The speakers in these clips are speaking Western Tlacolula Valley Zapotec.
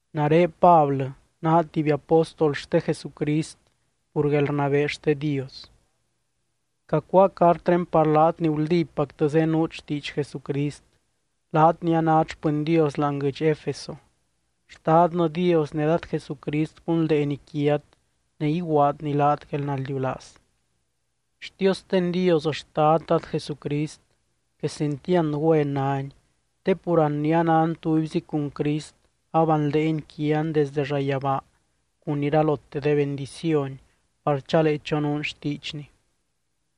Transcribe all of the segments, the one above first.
Nare Pablɨ, naa tuby apóstol xte Jesucrist pur guelrnabee xte Dios. Cacuáa cartré par laat ni guldípactɨ zenuut xtiidx Jesucrist, laat ni anát xpɨny Dios láani guɨdx Efeso. Xtadnɨ Dios ne Dad Jesucrist gunldeeny quiat ne iguaadny laat guelnaldiulaaz. Xtiosten Dios Xtad Dad Jesucrist quesentiand güen nány, te pur an ni anan tubyzi cun Crist abanldeeny quian desdɨ llayabaa cun iralote de bendiciony par chalee chonuun xtiidxny.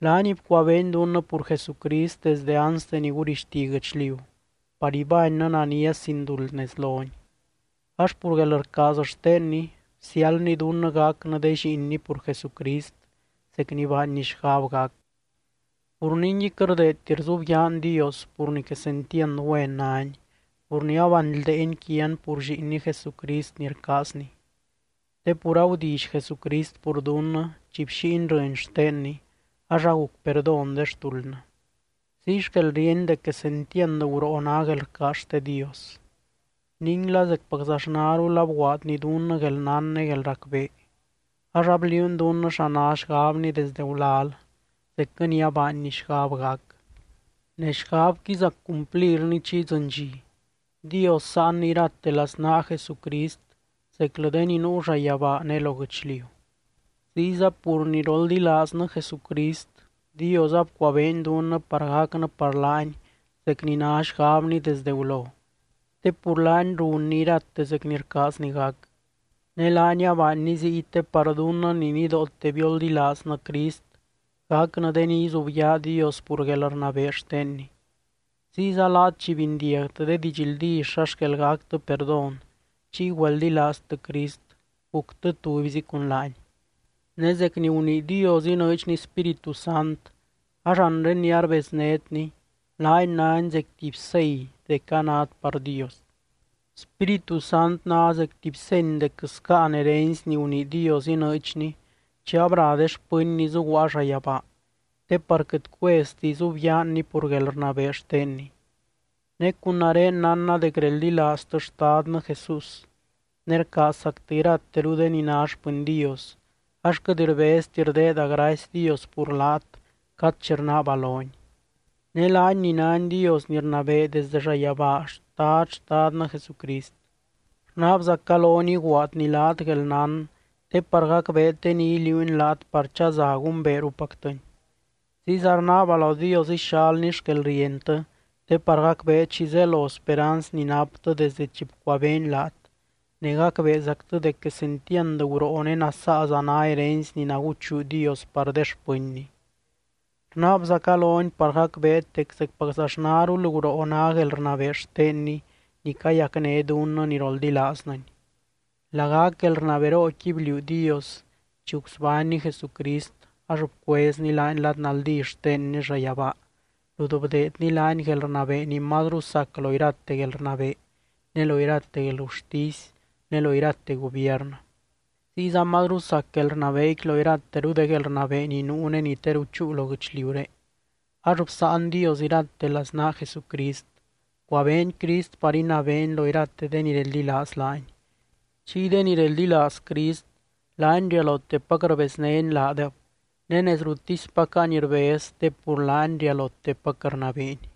Laany bcuabeeny dunnɨ pur Jesucrist desdɨ anste ni gurixti guɨchliu, par ibánnɨ nania sin duld nez lony. Ax pur guelrcaaz xtenny, bsiáldny dunnɨ gacnɨ de lliinny pur Jesucrist zec ni baanny xgab gac. Pur ningui, quɨt rdeedti rzubyaan Dios pur ni quesentiand güen nány, pur ni abanldeeny quian pur Lliinny Jesucrist ni rcaazny. Te pur agudilly Jesucrist pur dunnɨ chi bxíiny rɨny xtenny ax aguc perdón de xtuldnɨ. Ziy xquel ríeny dec quesentiand guroo ná guelrcaaz xte Dios. Ninguila zecpaczaxnarul abguaadny dunnɨ guelnán ne guelracbee, ax abliuuny dunnɨ xa ná xgabny desdɨ gulal, zecquɨ ni abaanny xgab gac. Ne xgabqui zac cumplirni chi idzɨny dxi, Dios sáanny irate laznaa Jesucrist zeclɨ de ni nuu llayabaa ne lo guɨchliu. Ziyza pur ni roldilaaznɨ Jesucrist, Dios abcuabeeny dunnɨ par gacnɨ par laany zec ni ná xgabny desdɨ gulo, te pur laany runny irate zec ni rcaazny gac. Ne laany abaanny ziy te par dunnɨ ni nidoote bioldilaaznɨ Crist gacnɨ de ni izubyaa Dios pur guelrnabee xtenny. Ziyza laat chi bindiagtɨ de didxldí xa xquel gactɨ perdón chiy güeldilaaztɨ Crist guctɨ tubyzi cun laany. Ne zec ni gunii Dios inɨɨdxny Spíritu Sant ax anre ni arbeznétny, laany nány zec tuby sei dec anát par Dios. Spíritu Sant ná zec tuby seny dec scáan herency ni gunii Dios inɨɨdxny chi abra de xpɨnny zuguaa llayabaa, te par quɨt cuezti izubyaanny pur guelrnabee xtenny. Ne cun nare nánna dec reldilaaztɨ Xtadnɨ Jesús ne rcaazzactɨ irateru de ni ná xpɨny Dios ax quɨt rbezti rdeeda gracy Dios pur laat cad chi rnaaba lony. Ne laany ni nány Dios ni rnabee desdɨ llayabaa, Xtad Xtadnɨ Jesucrist. Rnaabzaca lony iguaadny laat guelnán te par gacbeet de ni iliuuny laat par chaza gumbeerupactɨny. Ziyza rnaaba lo Dios ixalny xquelrientɨ te par gacbeet xi zelo speranz ni naptɨ desdɨ chi bcuabeeny laat, ne gacbeezactɨ dec quesentiand guroo ne nasaaza ná herency ni naguchuu Dios par de xpɨnny. Rnaabzaca lony par gacbeet dec zecpaczaxnarul guroo ná guelrnabee xtenny ni cayacné dunnɨ ni roldilaaznɨny. Lagac guelrnaberooquiy bliuu Dios chi gusbánny Jesucrist ax bcuezny laany lad naldí xtenny llayabaa rut bdeedny laany guelrnabee ni mazru sac lo irate guelrnabee, ne lo irate guelgurtisy ne lo irate gubiernɨ. Ziyza mazru sac guelrnabeequi lo irateru de guelrnabee ni nuu ne ni teru chúu lo guɨchliuré. Ax bsáan Dios irate laznaa Jesucrist, bcuabeeny Crist par inabeeny lo irate de ni reldilaaz laany. Chiy de ni reldilaaz Crist, laany rialotepac rbeznény laadeb ne nez ruttispac any rbez te pur laany rialotepac rnabeeny.